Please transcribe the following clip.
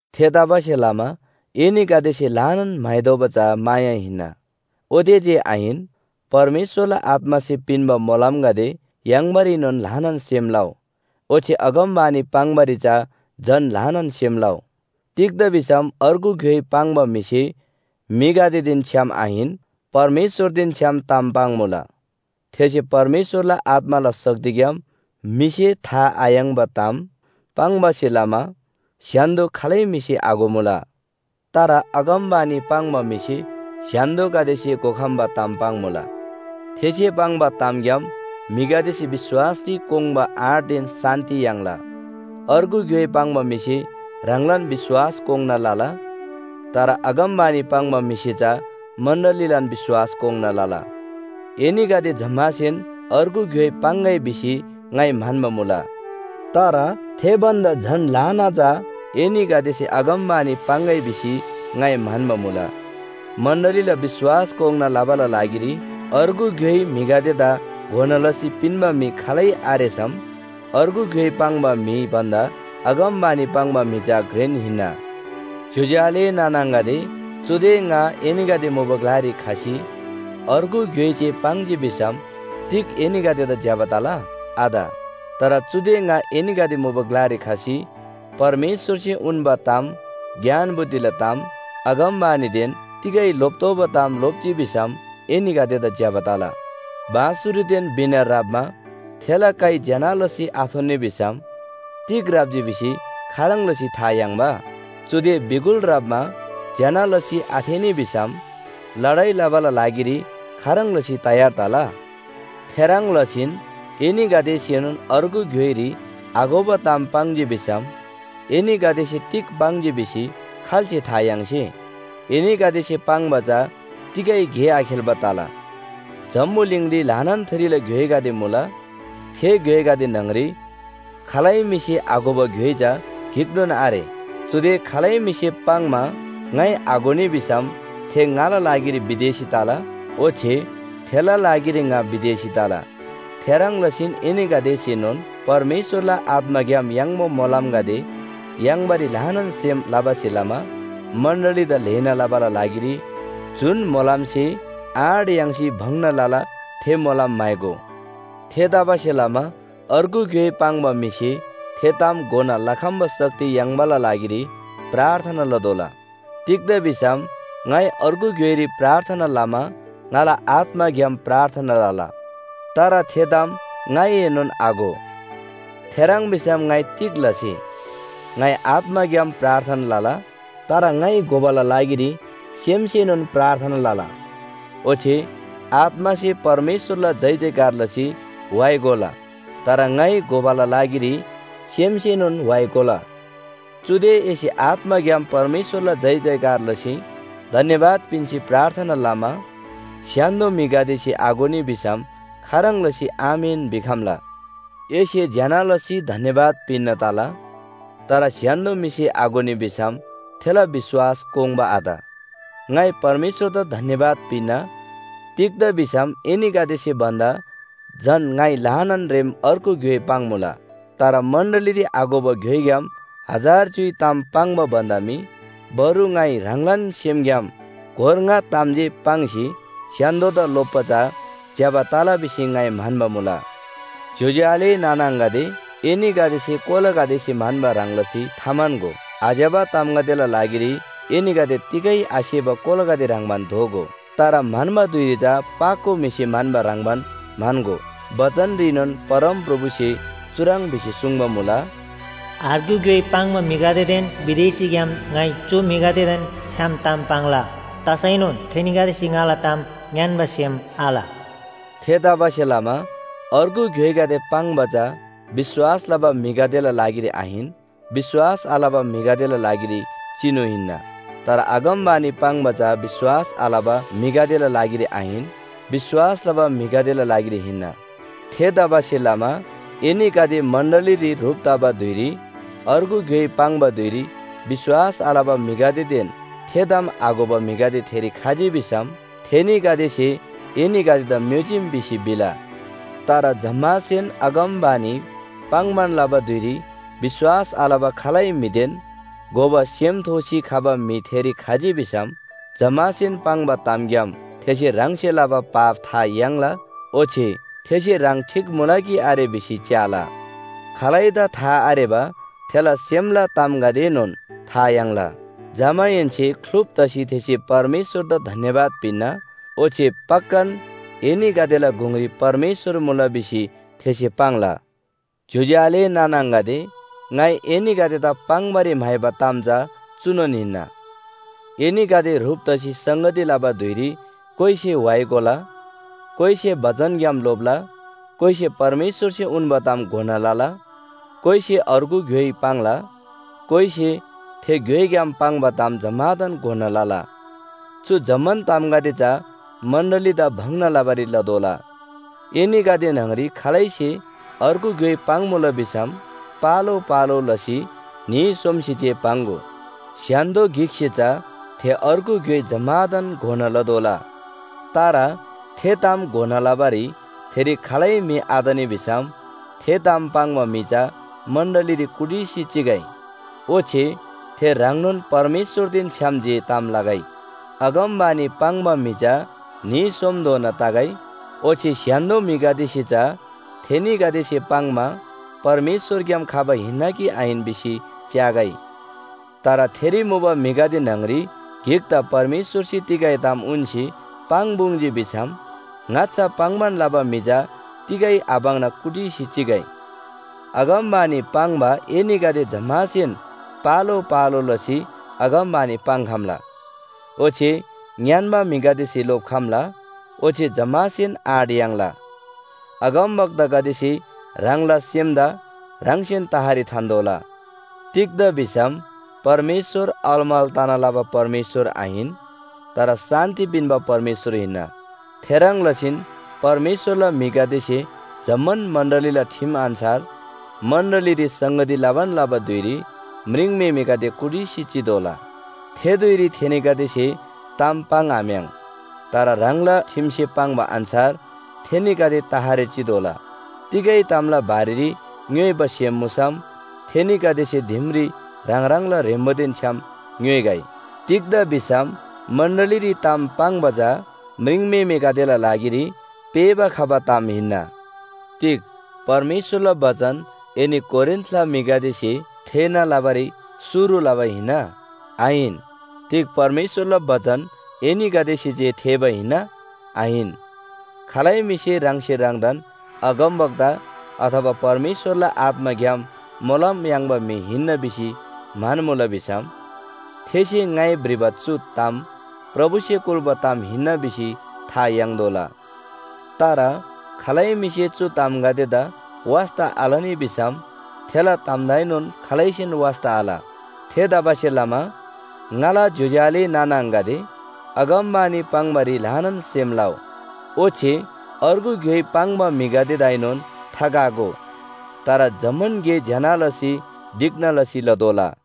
थेतबासेलमा एनीगदेसे ल्‍हानान म्‍हाइदोबा चा माया हिन्‍ना। ओते जे आहिन, परमेश्‍वरला आत्‍मासे पिन्‍बा मोलमगदे याङ्‌बारीनोन ल्‍हानान सेम लउ। ओच्‍छे अगमवाणी पाङ्‌बारी चा झन ल्‍हानान सेम लउ। तिग्‍दा भिसम अर्गु ग्‍योइ पाङ्बा म्‍हिसे म्‍हिगदेदेन छ्‌याम आहिन, परमेश्‍वरदेन छ्‌याम ताम पाङ्‌मुला। थेसे परमेश्‍वरला आत्‍माला शक्तिग्‍याम म्‍हिसे था आयाङ्‍बा ताम पाङ्बासे लमा स्‍य्‍हान्‍दो खालै म्‍हिसे आघोमुला। तर अगमवाणी पाङ्बा म्‍हिसे स्‍य्‍हान्‍दोगदेसे घोखम्‍बा ताम पाङ्‌मुला। थेसे पाङ्बा तामग्‍याम म्‍हिगदेसे विश्‍वासरी कोङ्बा आँटदेन शान्‍ति याङ्ला। अर्गु ग्‍योइ पाङ्बा म्‍हिसे ह्राङलान विश्‍वास कोङ्‌ना लला। तर अगमवाणी पाङ्बा म्‍हिसे चा मण्‍डलीलान विश्‍वास कोङ्‌ना लला। एनीगदे जम्‍मासेन अर्गु ग्‍योइ पाङ्‌गै भिसी ङाइ म्‍हन्‍बा मुला। तर थे भन्‍दा झन ल्‍हाना चा एनीगदेसे अगमवाणी पाङ्‌गै भिसी ङाइ म्‍हन्‍बा मुला। मण्‍डलीला विश्‍वास कोङ्‌ना लबाला लागिरी अर्गु ग्‍योइ म्‍हिगदेदा घोना लसी पिन्‍बा म्‍हि खालै आरेसम अर्गु ग्‍योइ पाङ्बा म्‍हि भन्‍दा अगमवाणी पाङ्बा म्‍हि चा घ्रेन हिन्‍ना। ज्‍योज्‍यो आले नाना आङागदे, चुदे ङा एनीगदे मुबा ग्‍लारी खसी अर्गु ग्‍योइ जे पाङ्जी भिसम तिग एनीगदेदा ज्‍यबा तला? आत। तर चुदे ङा एनीगदे मुबा ग्‍लारी खसी परमेश्‍वरसे उन्‍बा ताम, ज्ञान बुद्धिला ताम, अगमवाणीदेन तिगै लोप्‍तोःबा ताम लोप्‍जी भिसम एनीगदेदा ज्‍यबा तला। बाँसुरीदेन वीणा ह्राप्‍मा थेला काइ ज्‍यना लसी आथोन्‍नी भिसम तिग ह्राप्‍जी भिसी खाह्रङ् लसी था याङ्बा? चुदे बिगुल ह्राप्‍मा ज्‍यना लसी आथेःनी भिसम लडाइ लबाला लागिरी खाह्रङ् लसी तयार तला? थेह्रङ् लसीन एनीगदेसेनोन अर्गु ग्‍योइरी आघोबा ताम पाङ्जी भिसम एनीगदेसे तिग पाङ्जी भिसी खाल्‍से था याङ्से? एनीगदेसे पाङ्बा चा तिगै गे आखेल्‍बा तला। जम्‍बुलिङरी ल्‍हानान थरीला ग्‍योइगदे मुला। थे ग्‍योइगदे न्‍हङरी खालै म्‍हिसे आघोबा ग्‍योइ चा गिकनोन आरे। चुदे खालै म्‍हिसे पाङ्‌मा ङाइ आघोनी भिसम थे ङाला लागिरी विदेशी तला, ओच्‍छे थेला लागिरी ङा विदेशी तला। थेह्रङ् लसीन एनीगदेसेनोन परमेश्‍वरला आत्‍माग्‍याम याङ्बा मोलमगदे याङ्बारी ल्‍हानान सेम लबासे लमा मण्‍डलीदा ल्‍हेना लबाला लागिरी जुन मोलमसे आँट याङ्सी भङ्‍ना लला थे मोलम म्‍हाइगो। थेतबासेलमा अर्गु ग्‍योइ पाङ्बा म्‍हिसे थे ताम घोना लखम्‍बा शक्ति याङ्बाला लागिरी प्रार्थना लतोःला। तिग्‍दा भिसम ङाइ अर्गु ग्‍योइरी प्रार्थना लमा ङाला आत्‍माग्‍याम प्रार्थना लला। तर थे ताम ङाइएनोन आघो। थेह्रङ् भिसम ङाइ तिग लसे? ङाइ आत्‍माग्‍याम प्रार्थना लला, तर ङाइ घोबाला लागिरी सेमसेनोन प्रार्थना लला। ओच्‍छे आत्‍मासे परमेश्‍वरला जयजयकार लसी व्‍हाइ गोला, तर ङाइ घोबाला लागिरी सेमसेनोन व्‍हाइ गोला। चुदे एसे आत्‍माग्‍याम परमेश्‍वरला जयजयकार लसी धन्‍यवाद पिन्‍सी प्रार्थना लमा स्‍य्‍हान्‍दो म्‍हिगदेसे आघोनी भिसम खाह्रङ् लसी, “आमेन” भिखम्‍ला? एसे ज्‍यना लसी धन्‍यवाद पिन्‍ना तला, तर स्‍य्‍हान्‍दो म्‍हिसे आघोनी भिसम थेला विश्‍वास कोङ्बा आत। ङाइ परमेश्‍वरदा धन्‍यवाद पिन्‍ना, तिग्‍दा भिसम एनीगदेसे भन्‍दा झन ङाइ ल्‍हानान रेम अर्गु ग्‍योइ पाङ्‌मुला। तर मण्‍डलीरी आघोबा ग्‍योइग्‍याम हजार च्‍युइ ताम पाङ्बा भन्‍दा मी बरु ङाइ ह्राङलान सेमग्‍याम गोर ङा ताम जे पाङ्सी स्‍य्‍हान्‍दोदा लोप्‍बा चा ज्‍यबा तला भिसी ङाइ म्‍हन्‍बा मुला। ज्‍योज्‍यो आले नाना आङागदे, एनीगदेसे कोलागदेसे म्‍हन्‍बा ह्रङ् लसी थाम्‍हन्‍गो। आज्‍यबा तामगदेला लागिरी एनीगदे तिगै आसेबा कोलागदे ह्रङ्‌बान दोगो। तर म्‍हन्‍बा धुइरी चा पाको म्‍हिसे म्‍हन्‍बा ह्रङ्‌बान म्‍हन्‍गो। बचनरीनोन परमप्रभुसे चुह्रङ् भिसी सुङ्बा मुला, “अर्गु ग्‍योइ पाङ्बा म्‍हिगदेदेन विदेशीग्‍याम ङाइ चु म्‍हिगदेदेन छ्‌याम ताम पाङ्ला। तसैनोन थेनीगदेसे ङाला ताम ङ्‌यान्‍बा सेम आल।” थेतबासेलमा अर्गु ग्‍योइगदे पाङ्बा चा विश्‍वास लबा म्‍हिगदेला लागिरी आहिन, विश्‍वास आलबा म्‍हिगदेला लागिरी चिनु हिन्‍ना। तर अगमवाणी पाङ्बा चा विश्‍वास आलबा म्‍हिगदेला लागिरी आहिन, विश्‍वास लबा म्‍हिगदेला लागिरी हिन्‍ना। थेतबासेलमा एनीगदे मण्‍डलीरी ह्रुप तबा धुइरी अर्गु ग्‍योइ पाङ्बा धुइरी विश्‍वास आलबा म्‍हिगदेदेन थे ताम आघोबा म्‍हिगदे थेरी खजी भिसम थेनीगदेसे एनीगदेदा म्‍योजीम भिसी भिला। तर जम्‍मासेन अगमवाणी पाङ्‌बान लबा धुइरी विश्‍वास आलबा खालै म्‍हिदेन घोबा सेम थोसी खबा म्‍हि थेरी खजी भिसम जम्‍मासेन पाङ्बा तामग्‍याम थेसे ह्राङसे लबा पाप था याङ्ला ओच्‍छे थेसे ह्राङ ठीक मुला कि आरे भिसी च्‍याला। खालैदा था आरेबा थेला सेमला तामगदेएनोन था याङ्ला। जमाहेन्‍से ख्‍लुप तसी थेसे परमेश्‍वरदा धन्‍यवाद पिन्‍ना, ओच्‍छे “पक्‍कान, एनीगदेला गुङरी परमेश्‍वर मुला” भिसी थेसे पाङ्ला। ज्‍योज्‍यो आले नाना आङागदे, ङाइ एनीगदेदा पाङ्‌बारी म्‍हाइबा ताम चा चुनोन हिन्‍ना, एनीगदे ह्रुप तसी संगती लबा धुइरी कोइसे व्‍हाइ गोला, कोइसे बचनग्‍याम लोप्‍ला, कोइसे परमेश्‍वरसे उन्‍बा ताम घोना लला, कोइसे अर्गु ग्‍योइ पाङ्ला, कोइसे थे ग्‍योइग्‍याम पाङ्बा ताम जम्‍मादान घोना लला। चु जम्‍मान तामगदे चा मण्‍डलीदा भङ्‍ना लबारी लतोःला। एनीगदे न्‍हङरी खालैसे अर्गु ग्‍योइ पाङ्‌मुला भिसम, पालो पालो लसी न्‍ही सोमसे जे पाङ्‍गो, स्‍य्‍हान्‍दो गिकसे चा थे अर्गु ग्‍योइ जम्‍मादान घोना लतोःला। तर थे ताम घोना लबारी थेरी खालै म्‍हि आतनी भिसम थे ताम पाङ्बा म्‍हि चा मण्‍डलीरी कुटिसी चिगै। ओच्‍छे थे ह्राङनोन परमेश्‍वरदेन छ्‌याम जे ताम लगै। अगमवाणी पाङ्बा म्‍हि चा न्‍ही सोमधोना तगै, ओच्‍छे स्‍य्‍हान्‍दो म्‍हिगदेसे चा थेनीगदेसे पाङ्‌मा परमेश्‍वरग्‍याम खबा हिन्‍ना कि आहिन भिसी च्‍यागै। तर थेरी मुबा म्‍हिगदे न्‍हङरी गिकदा परमेश्‍वरसे तिगै ताम उन्‍सी पाङ्‌पुङ्‌जी भिसम ङाच्‍छा पाङ्‌बान लबा म्‍हि चा तिगै आपाङ्ना कुटिसी चिगै। अगमवाणी पाङ्बा एनीगदे जम्‍मासेन पालो पालो लसी अगमवाणी पाङ्‌खम्‍ला, ओच्‍छे ङ्‌यान्‍बा म्‍हिगदेसे लोप्‍खम्‍ला ओच्‍छे जम्‍मासेन आँट याङ्ला। अगमवक्तागदेसे ह्राङला सेमदा ह्राङसेन तहरी थान्‍तोःला। तिग्‍दा भिसम परमेश्‍वर अलमल तना लबा परमेश्‍वर आहिन, तर शान्‍ति पिन्‍बा परमेश्‍वर हिन्‍ना। थेह्रङ् लसीन परमेश्‍वरला म्‍हिगदेसे जम्‍मान मण्‍डलीला ठिम अन्‍छार, मण्‍डलीरी संगती लबान लबा धुइरी म्रिङम्‍हेमेगदे कुटिसी चितोःला। थे धुइरी थेनीगदेसे ताम पाङ्‌आम्‍याङ्। तर ह्राङला ठिमसे पाङ्बा अन्‍छार थेनीगदे तहरी चितोःला। तिगै तामला बारेरी ङ्‌योइबा सेम मुसम थेनीगदेसे दिमरी ह्राङ ह्राङला ह्रेम्‍बोदेन छ्‌याम ङ्‌योइगै। तिग्‍दा भिसम मण्‍डलीरी ताम पाङ्बा चा म्रिङम्‍हेमेगदेला लागिरी पेःबा खबा ताम हिन्‍ना। तिग परमेश्‍वरला बचन एनी कोरिन्‍थला म्‍हिगदेसे थेःना लबारी शुरु लबा हिन्‍ना? आहिन। तिग परमेश्‍वरला बचन एनीगदेसे जे थेःबा हिन्‍ना? आहिन। खालै म्‍हिसे ह्राङसे ह्राङदान अगमवक्ता अथवा परमेश्‍वरला आत्‍माग्‍याम मोलम याङ्बा म्‍हि हिन्‍ना भिसी म्‍हन्‍मुला भिसम, थेसे ङाइ भ्रिबा चु ताम प्रभुसे कुल्‍बा ताम हिन्‍ना भिसी था याङ्‌तोःला। तर खालै म्‍हिसे चु तामगदेदा वास्‍ता आलनी भिसम थेला तामदाएनोन खालैसेन वास्‍ता आल। थेतबासेलमा ङाला ज्‍योज्‍यो आले नाना आङागदे, अगमवाणी पाङ्‌बारी ल्‍हानान सेम लउ, ओच्‍छे अर्गु ग्‍योइ पाङ्बा म्‍हिगदेदाएनोन थाकागो। तर जम्‍मान गे ज्‍यना लसी ढिक्‍ना लसी लतोःला।